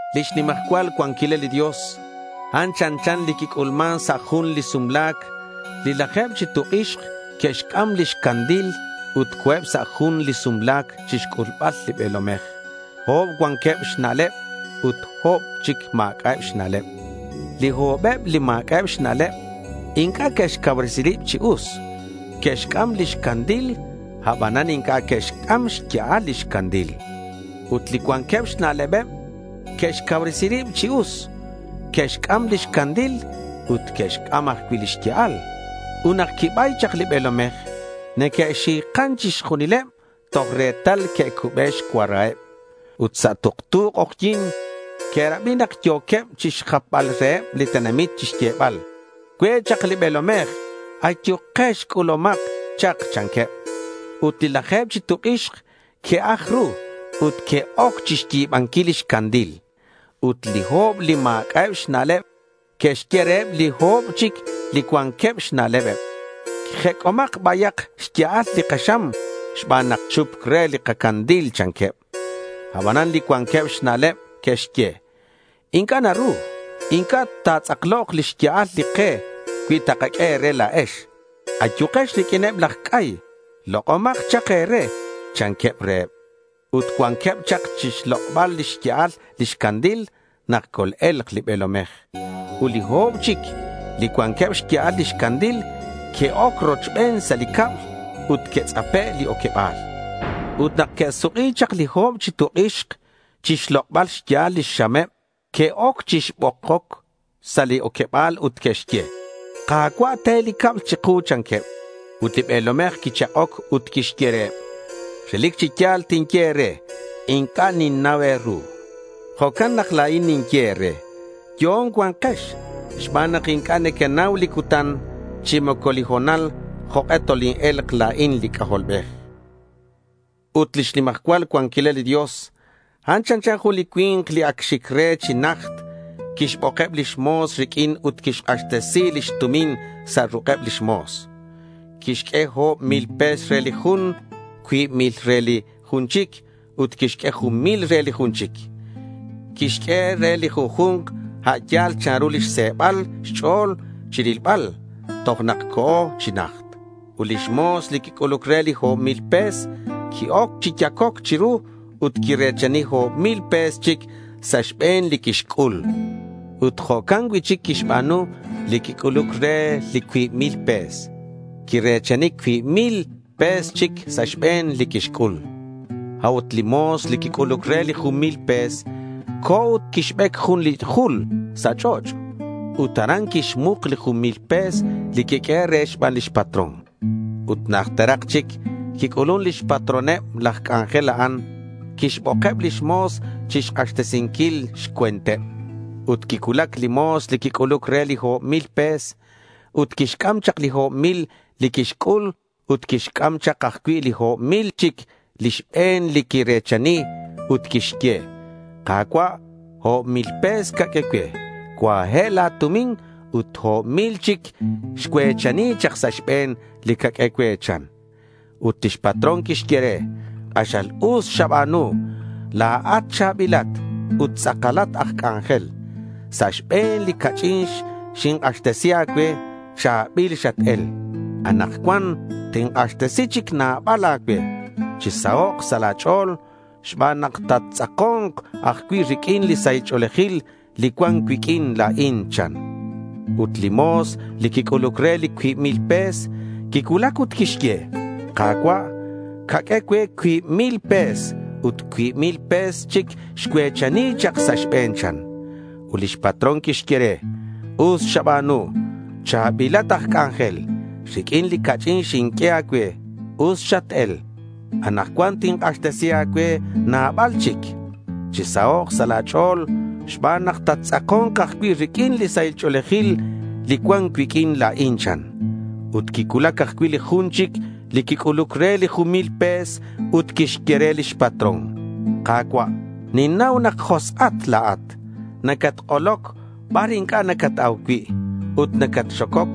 Lix nimajcual cuanquilal li Dios, a'an chanchan li quic'ulman sa' jun li sumla̱c. Li laje̱b chi tuk' ix que'xc'am lix candil ut co̱eb sa' jun li sumla̱c chixc'ulbal li be̱lomej. O̱b cuanqueb xna'leb ut li o̱b chic ma̱c'a' xna'lebeb. Li o̱beb li ma̱c'a'eb xna'leb inc'a' que'xcauresi rib chi us. Que'xc'am lix candil, abanan inc'a' que'xc'am xya'al lix candil. Ut li cuanqueb xna'lebeb que'xcauresi rib chi us, que'xc'am lix candil ut que'xc'am ajcui' lix ya'al. Ut nak quibay chak li be̱lomej, neque'xi̱kan chixjunileb toj retal quicube xcuaraheb. Ut sa' tuktu k'ojyi̱n, que'rabi nak yo̱queb chixjapbal reheb li tenamit chixyebal: —Cue' chak li be̱lomej. Ayukex, c'ulumak chak, chanqueb. Ut li laje̱b chi tuk' ix que'aj ru ut que'oc xyi̱banquil lix candil. Ut li o̱b li ma̱c'a'eb xna'leb que'xye reheb li o̱b chic li cuanqueb xna'leb: —Jec'omak bayak xya'al li kaxam xban nak chupc re li kacandil, chanqueb. Aban li cuanqueb xna'leb que'xye: —Inc'a' naru. Inc'a' ta̱tz'aklok li xya'al li ke cui takaq'ue e̱re la̱ex. Ayukex riq'uineb laj c'ay. Lok'omak chak e̱re, chanqueb reheb. Ut cuanqueb chak chixlok'bal lix ya'al lix candil nak col-e̱lk li be̱lomej. Ut li o̱b chic li cuanqueb xya'al lix candil que'oc rochben sa' li cab. Ut quitz'ape' li oqueba̱l. Ut nak que'suk'i chak li o̱b chi tuk' ix chixlok'bal xya'al lix xameb, que'oc chibokoc sa' li oqueba̱l ut que'xye: —Ka̱cua', te li cab chiku, chanqueb. Ut li be̱lomej quichak'oc ut quixye reheb: —Relic chi ya̱l tinye e̱re inc'a' ninnau e̱ru.— Jo'can nak la̱in ninye e̱re: Yo'on cua̱nkex xban nak inc'a' nequenau li cutan chi moco li ho̱nal jok'e toline̱lk la̱in li C'ajolbej. Ut lix nimajcual cuanquilal li Dios, a'an chanchan jun li cui̱nk li ac xic re chi najt. Quixbokeb lix mo̱s riq'uin ut quixk'axtesi lix tumin sa' ruk'eb lix mo̱s. Quixq'ue o̱b mil pe̱s re li jun, cuib mil re li jun chic ut quixq'ue jun mil re li jun chic. Quixq'ue re li junju̱nk a' yal chanru lix se̱bal xch'o̱l chi rilbal. Tojo'nak co̱ chi najt. Ut li mo̱s li quic'uluc re li o̱b mil pe̱s, qui-oc chi yacoc chiru ut quire̱chani o̱b mil pe̱s chic sa' xbe̱n li quixc'ul. Ut jo'can cui'chic quixba̱nu li quic'uluc re li cuib mil pe̱s. Ut quire̱chani cuib mil pe̱s chic sa' xbe̱n li quixc'ul. A'ut li mo̱s li quic'uluc re li jun mil pe̱s, co̱ ut quixbec jun li jul sa' ch'och'. Ut aran quixmuk li jun mil pe̱s li quiq'uehe' re xban lix patrón. Ut najterak chic, quic'ulun lix patroneb laj c'anjel a'an. Quixbokeb lix mo̱s chixk'axtesinquil xcue̱nteb. Ut quicuulac li mo̱s li quic'uluc re li o̱b mil pe̱s. Ut quixc'am chak li o̱b mil li quixc'ul ut quixc'am chak ajcui' li o̱b mil chic li xbe̱n li quire̱chani, ut quixye: —Ka̱cua', o̱b mil pe̱s caq'ue cue. Cuaye' la̱ tumin ut o̱b mil chic xcue̱chani chak sa' xbe̱n li caq'ue cue, chan. Ut lix patrón quixye re: —K'axal us xaba̱nu. La̱at cha̱bilat ut tz'akalat aj c'anjel. Sa' xbe̱n li ca'ch'in xink'axtesi a̱cue, cha̱bil xat-el. Anakcuan tink'axtesi chic nabal a̱cue. Chisahok' sa' la̱ ch'o̱l xban nak tattz'ako̱nk ajcui' riq'uin li sahil ch'o̱lejil li cuan cuiq'uin la̱in, chan. Ut li mo̱s li quic'uluc re li cuib mil pe̱s quicuulac ut quixye: —Ka̱cua', caq'ue cue cuib mil pe̱s ut cuib mil pe̱s chic xcue̱chani chak sa' xbe̱n, chan. Ut lix patrón quixye re: —Us xaba̱nu. Cha̱bilat aj c'anjel. Riq'uin li ca'ch'in xinq'ue a̱cue, us xat-el. Anakcuan tink'axtesi a̱cue nabal chic. Chisahok' sa' la̱ ch'o̱l xban nak tattz'ako̱nk ajcui' riq'uin li sahil ch'o̱lejil li cuan cuiq'uin la̱in, chan. Ut quicuulac ajcui' li jun chic li quic'uluc re li jun mil pe̱s ut quixye re lix patrón: —Ka̱cua', ninnau nak josk'at la̱at. Nacatk'oloc bar inc'a' nacat-au cui', ut nacatxococ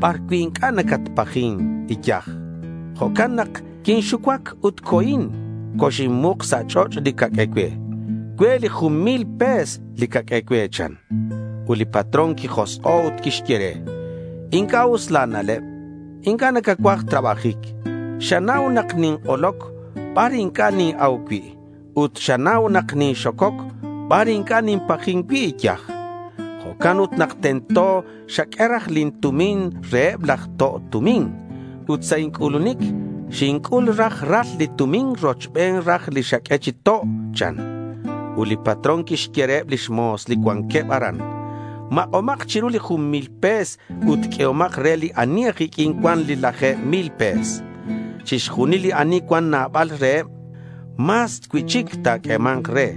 bar cui' inc'a' nacatpajin iyaj. Jo'can nak quinxucuac ut co̱in ut coxinmuk sa' ch'och' li caq'ue cue. Cue' li jun mil pe̱s li caq'ue cue, chan. Ut li patrón quijosk'o' ut quixye re: —Inc'a' us la̱ na'leb. Inc'a' nacacuaj trabajic. Xanau nak nink'oloc bar inc'a' nin-au cui'. Ut xanau nak ninxococ bar inc'a' ninpajin cui' iyaj. Jo'can ut tento nak xaq'ue raj lin tumin reheb laj to' tumin. Ut sa' inc'ulunic, xinc'ul raj ral lin tumin rochben raj li xaq'ue chi to', chan. Ut li patrón quixye reheb lix mo̱s li cuanqueb aran: —Mak'omak chiru li jun mil pe̱s ut q'uehomak re li ani aj iq'uin cuan li laje̱b mil pe̱s. Chixjunil li ani cuan nabal reheb, mas cui'chic ta̱q'uema̱nk re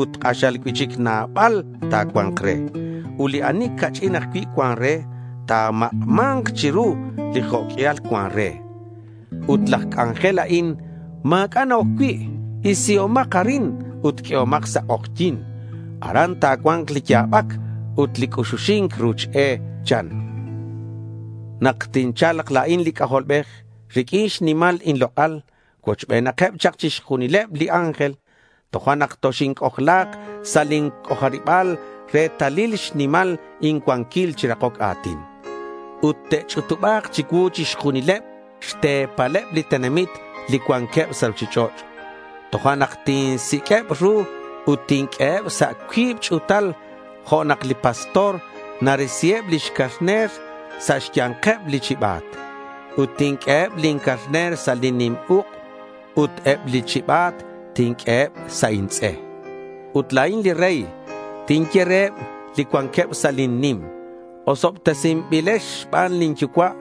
ut k'axal cui'chic nabal ta̱cua̱nk re. Ut li ani ca'ch'in ajcui' cuan re, ta̱mak'ma̱nk chiru li jo' q'uial cuan re. Ut laj c'anjel a'in, ma̱c'a' na-oc cui'. Isihomak arin ut q'uehomak sa' k'ojyi̱n. Aran ta̱cua̱nk li ya̱bac ut li c'uxuxi̱nc ruch e, chan. Nak tincha̱lk la̱in li C'ajolbej riq'uin xnimal inlok'al cuochbenakeb chak chixjunileb li ángel, tojo'nak toxinc'ojla̱k sa' lin c'ojariba̱l retalil xnimal incuanquil chi rakoc a̱tin. Ut te'ch'utuba̱k chicuu chixjunil xte̱paleb li tenamit li cuanqueb sa' ruchich'och'. Tojo'nak tinsiq'ueb ru ut tinq'ueheb sa' cuib ch'u̱tal jo' nak li pastor narisiheb lix carner sa' xya̱nkeb li chiba̱t. Ut tinq'ueheb lin carner sa' lin nim uk' ut eb li chiba̱t tinq'ue sa' intz'e. Ut la̱in li Rey tinye reheb li cuanqueb sa' lin nim: —Osobtesinbilex xban lin Yucua'.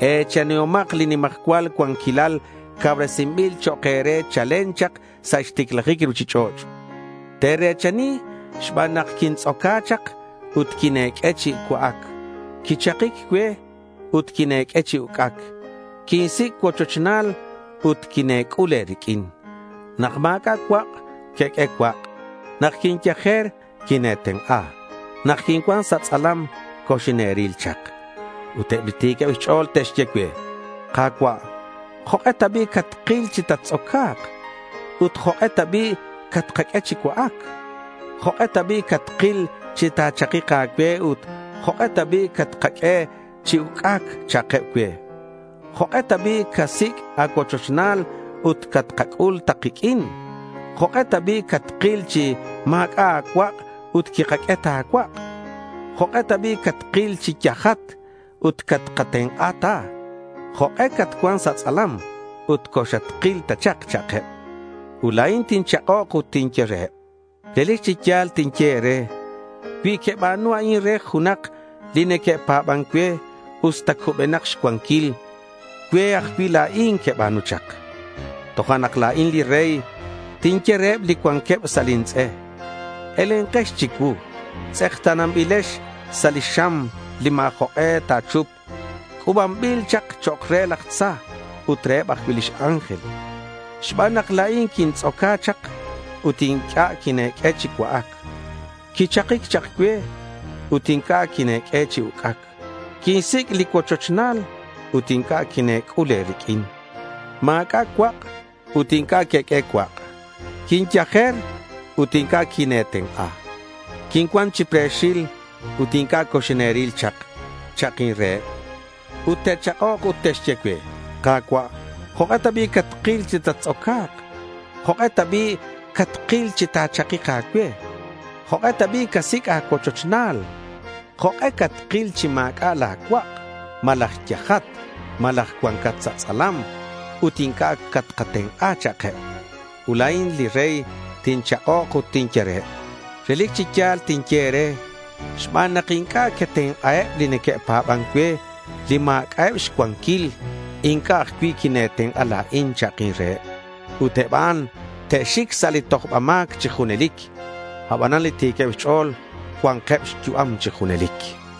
E̱chanihomak li nimajcual cuanquilal cauresinbil chok' e̱re chalen chak sa' xticlajic li ruchich'och'. Te̱re̱chani xban nak quintz'oca chak ut quine̱q'ue chi cua'ac. Quichakic cue ut quine̱q'ue chi uc'ac. Quinsic' cuochochnal ut quine̱c'ul e̱riq'uin. Nak ma̱c'a' cuak', queq'ue cuak'. Nak quinyajer, quine̱tenk'a. Nak quincuan sa' tz'alam, coxine̱ril chak. Ut eb li ti̱queb xch'o̱l te'xye cue: —Ka̱cua', ¿jok'e ta bi' catkil chi tattz'oca̱k ut jok'e ta bi' catkaq'ue chi cua'ac? ¿Jok'e ta bi' catkil chi ta̱chakik a̱cue ut jok'e ta bi' catkaq'ue chi uc'ac? cha'keb cue. ¿Jok'e ta bi' casic' a̱cuochochnal ut catkac'ul ta kiq'uin? ¿Jok'e ta bi' catkil chi ma̱c'a' a̱cuak' ut quikaq'ue ta a̱cuak'? ¿Jok'e ta bi' catkil chi yajat ut catkatenk'a ta? ¿Jok'e catcuan sa' tz'alam ut coxatkil ta chak? cha'keb. Ut la̱in tinchak'ok ut tinye reheb: —Relic chi ya̱l tinye e̱re, cui queba̱nu a'in re junak li neque'pa̱ban cue, usta cubenak xcuanquil, cue ajcui' la̱in queba̱nu chak. Tojo'nak la̱in li Rey tinye reheb li cuanqueb sa' lin tz'e: —Elenkex chicuu. Tz'ekta̱nanbilex sa' li xam li ma̱ jok'e ta̱chupk c'u̱banbil chak chok' re laj tza ut reheb ajcui' lix ángel. Xban nak la̱in quintz'oca chak ut inc'a' quine̱q'ue chi cua'ac. Quichakic chak cue ut inc'a' quine̱q'ue chi uc'ac. Quinsic' li cuochochnal ut inc'a' quine̱c'ul e̱riq'uin. Ma̱c'a' cuak' ut inc'a' queq'ue cuak'. Quinyajer ut inc'a' quine̱tenk'a. Quincuan chi pre̱xil ut inc'a' coxine̱ril chak, cha'kin reheb. Ut te'chak'ok ut te'xye cue: —Ka̱cua', ¿jok'e ta bi' catkil chi tattz'oca̱k? ¿Jok'e ta bi' catkil chi ta̱chakik a̱cue? ¿Jok'e casic' a̱cuochochnal? ¿Jok'e catkil chi ma̱c'a' la̱ cuak' malaj yajat, malaj cuancat sa' tz'alam ut inc'a' catkatenk'a? cha'keb. Ut la̱in li Rey tinchak'ok ut tinye reheb: —Relic chi ya̱l tinye e̱re, xban nak inc'a' quetenk'aheb li neque'pa̱ban cue li ma̱c'a'eb xcuanquil, inc'a' ajcui' quine̱tenk'a la̱in, cha'kin reheb. Ut eb a'an te'xic sa' li tojba ma̱c chi junelic. Abanan li ti̱queb xch'o̱l cua̱nkeb xyu'am chi junelic.